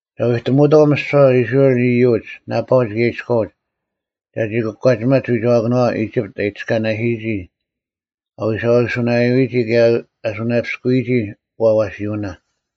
ᒐ ᐎᑎᒧᐅᑥᐤ ᒥᓯᐛ ᐃᔅᕋᐃᓪ ᐃᔪᒡ, ᓇᐸᐅᒡ ᑭᔭ ᐃᔎᐅᒡ ᒐᒋ ᑯᒂᒋᒪᒡ ᐎᒐᐛᑭᓄᐛᐛ ᐃᒋᑉᑦ ᐊ ᐃᑎᔅᑲᓇᓯᔨᒋ ᐊ ᐎᓴᐅᓱᓇᔭᐎᒋ ᑭᔭ ᐊ ᓱᓇᔭᐱᔅᑯᔨᒋ ᐛᐛᓯᐅᓇ᙮”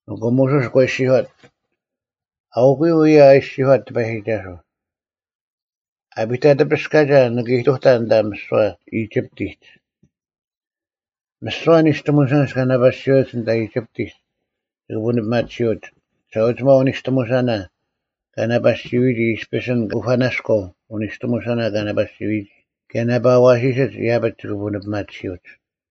ᐊᑯ ᒧᓱᔅ ᒂ ᐃᔅᒋᔄᑦ, “ᐊᐅᑯᔪᐤ ᐅᔭ ᐊ ᐃᔅᒋᔄᑦ ᑎᐸᔨᒋᒐᓱᐤ: ‘ᐊᐱᑕᑎᐱᔅᑲᒐ ᓂᑭ ᐃᑐᑕᓐ ᐊᓐᑕ ᒥᓯᐛ ᐃᒋᑉᑎᒡ᙮ ᒥᓯᐛ ᓂᔅᑎᒧᓴᓐᒡ ᑲ ᓇᐸᓯᐅᒡ ᐊᓐᑕ ᐃᒋᑉᑎᒡ ᒋᑭ ᐳᓂᐱᒪᑎᓯᐅᒡ, ᒋᓴᐅᒋᒪᐤ ᐅᓂᔅᑎᒧᓴᓇ ᑲ ᓇᐸᓯᐎᔨᒋ ᐃᔅᐱᔅ ᐊᓐ ᑯᐸᓇᔎᐤ ᐅᓂᔅᑎᒧᓴᓇ ᑲ ᓇᐸᓯᐎᔨᒋ ᑭᔭ ᓇᐸ ᐊᐛᓯᓯᒡ ᐃᔭᐱᒡ ᒋᑭ ᐳᓂᐱᒪᑎᓯᐅᒡ᙮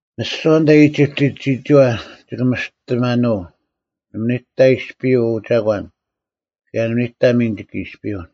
ᒥᓯᐛ ᐊᓐᑕ ᐃᒋᑉᑎᒡ ᒋᒋᐛ ᒋᑭ ᒥᔅᑎ ᒪᓄᐤ, ᓇᒪ ᓂᑕ ᐃᔅᐱᔪᐤ ᐅ ᒐᒂᓐ ᑭᔭ ᓇᒪ ᓂᑕ ᒥᓐ ᒋᑭ ᐃᔅᐱᔪᐤ᙮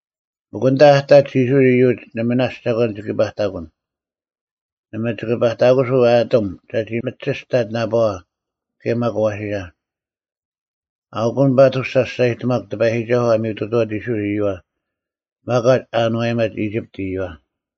ᒥᒄ ᐊᓐᑕ ᐊᑕᒡ ᐃᔅᕋᐃᓪ ᐃᔪᒡ, ᓇᔅᒡ ᓇᒪ ᒐᒂᓐ ᒋᑭ ᐸᑕᑯᓐ, ᓇᒪ ᒋᑭ ᐸᑕᑯᓱᐤ ᐊᑎᒻ ᒐᒋ ᒥᒋᔅᑕᑦ ᓇᐸᐛ ᑭᔭ ᒪᒃ ᐊᐛᓯᓴ᙮’ ᐊᐅᑯᓐ ᐸᑐᔅ ᒐ ᒋᔅᒐᔨᑎᒪᒄ ᑎᐸᔨᒋᒐᓱᐤ ᐊ ᒥᔪᑐᑐᐛᑦ ᐃᔅᕋᐃᓪ ᐃᔪᐛ ᒪᒂᒡ ᐊ ᐊᓏᔨᒪᑦ ᐃᒋᑉᑦ ᐃᔪᐛ᙮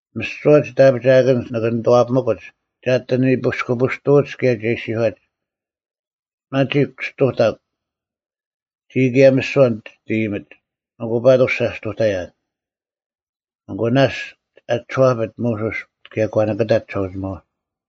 ᒥᓯᐛ ᒋᑦ ᐊᐱᒋᐊᑭᓐᒡ ᓂᑭ ᓂᑐᐛᐱᒥᑯᒡ ᒐ ᐊᑎ ᓂᐱᔅᑯᐱᔅᑐᐅᒡ ᑭᔭ ᒐ ᐃᔅᒋᔄᒡ, ‘ᒪᒋᒄ ᔅᑐᑕᒄ! ᒋᔾ ᑭᔭ ᒥᓯᐛ ᒋᑦ ᐃᔨᒥᒡ!’ ᐊᑯ ᐸᑐᔅ ᒐᔅᑐᑕᔭᓐ᙮” ᐊᑯ ᓇᔅᒡ ᐊ ᒋᔄᐱᑦ ᒧᓱᔅ ᒂ ᓂᑭᑕᑦ ᒋᓴᐅᒋᒪᐛ᙮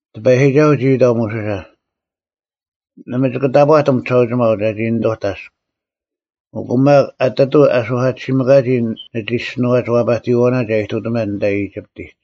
ᑎᐸᔨᒋᒐᓱᐤ ᒋ ᐃᑕᐤ ᒧᓱᓴ, “ᓇᒪ ᒋᑭ ᑕᑈᑎᒻ ᒋᓴᐅᒋᒪᐤ ᒐᒋ ᓂᑐᑕᔅᒄ, ᐊᑯ ᒪᒃ ᐊᑎᑐᐤ ᐊ ᓱᐧᑲᑎᓯᒥᑲᒋ ᓂᒋᔅᒋᓄᐛᒡ ᐛᐸᑎᔨᐛᐅᓇ ᒐ ᐃᑐᑎᒪᓐ ᐊᓐᑕ ᐃᒋᑉᑎᒡ᙮”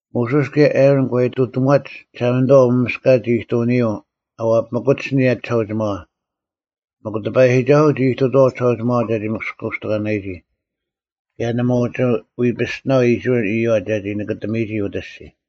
ᒧᓱᔅ ᑭᔭ ᐊᕋᓐ ᒂ ᐃᑐᑎᒺᒡ ᒋᓴᒪᓂᑐᐛ ᐅᒪᒥᔅᑲᒡ ᐃᑐᐅᓂᔪᐤ ᐊ ᐛᐱᒥᑯᒡ ᐊᓂᔭ ᒋᓴᐅᒋᒪᐛ, ᒥᒄ ᑎᐸᔨᒋᒐᓱᐤ ᒋ ᐃᑐᑐᐛᐤ ᒋᓴᐅᒋᒪᐛ ᒐᒋ ᒥᔅᑯᔅᑎᒂᓇᔨᒋ, ᑭᔭ ᓇᒪ ᐅᒋ ᐎ ᐱᔅᑎᓇᐤ ᐃᔅᕋᐃᓪ ᐃᔪᐛ ᒐᒋ ᓂᑭᑎᒥᔨᒋ ᐅᑦ ᐊᔅᒋᔾ᙮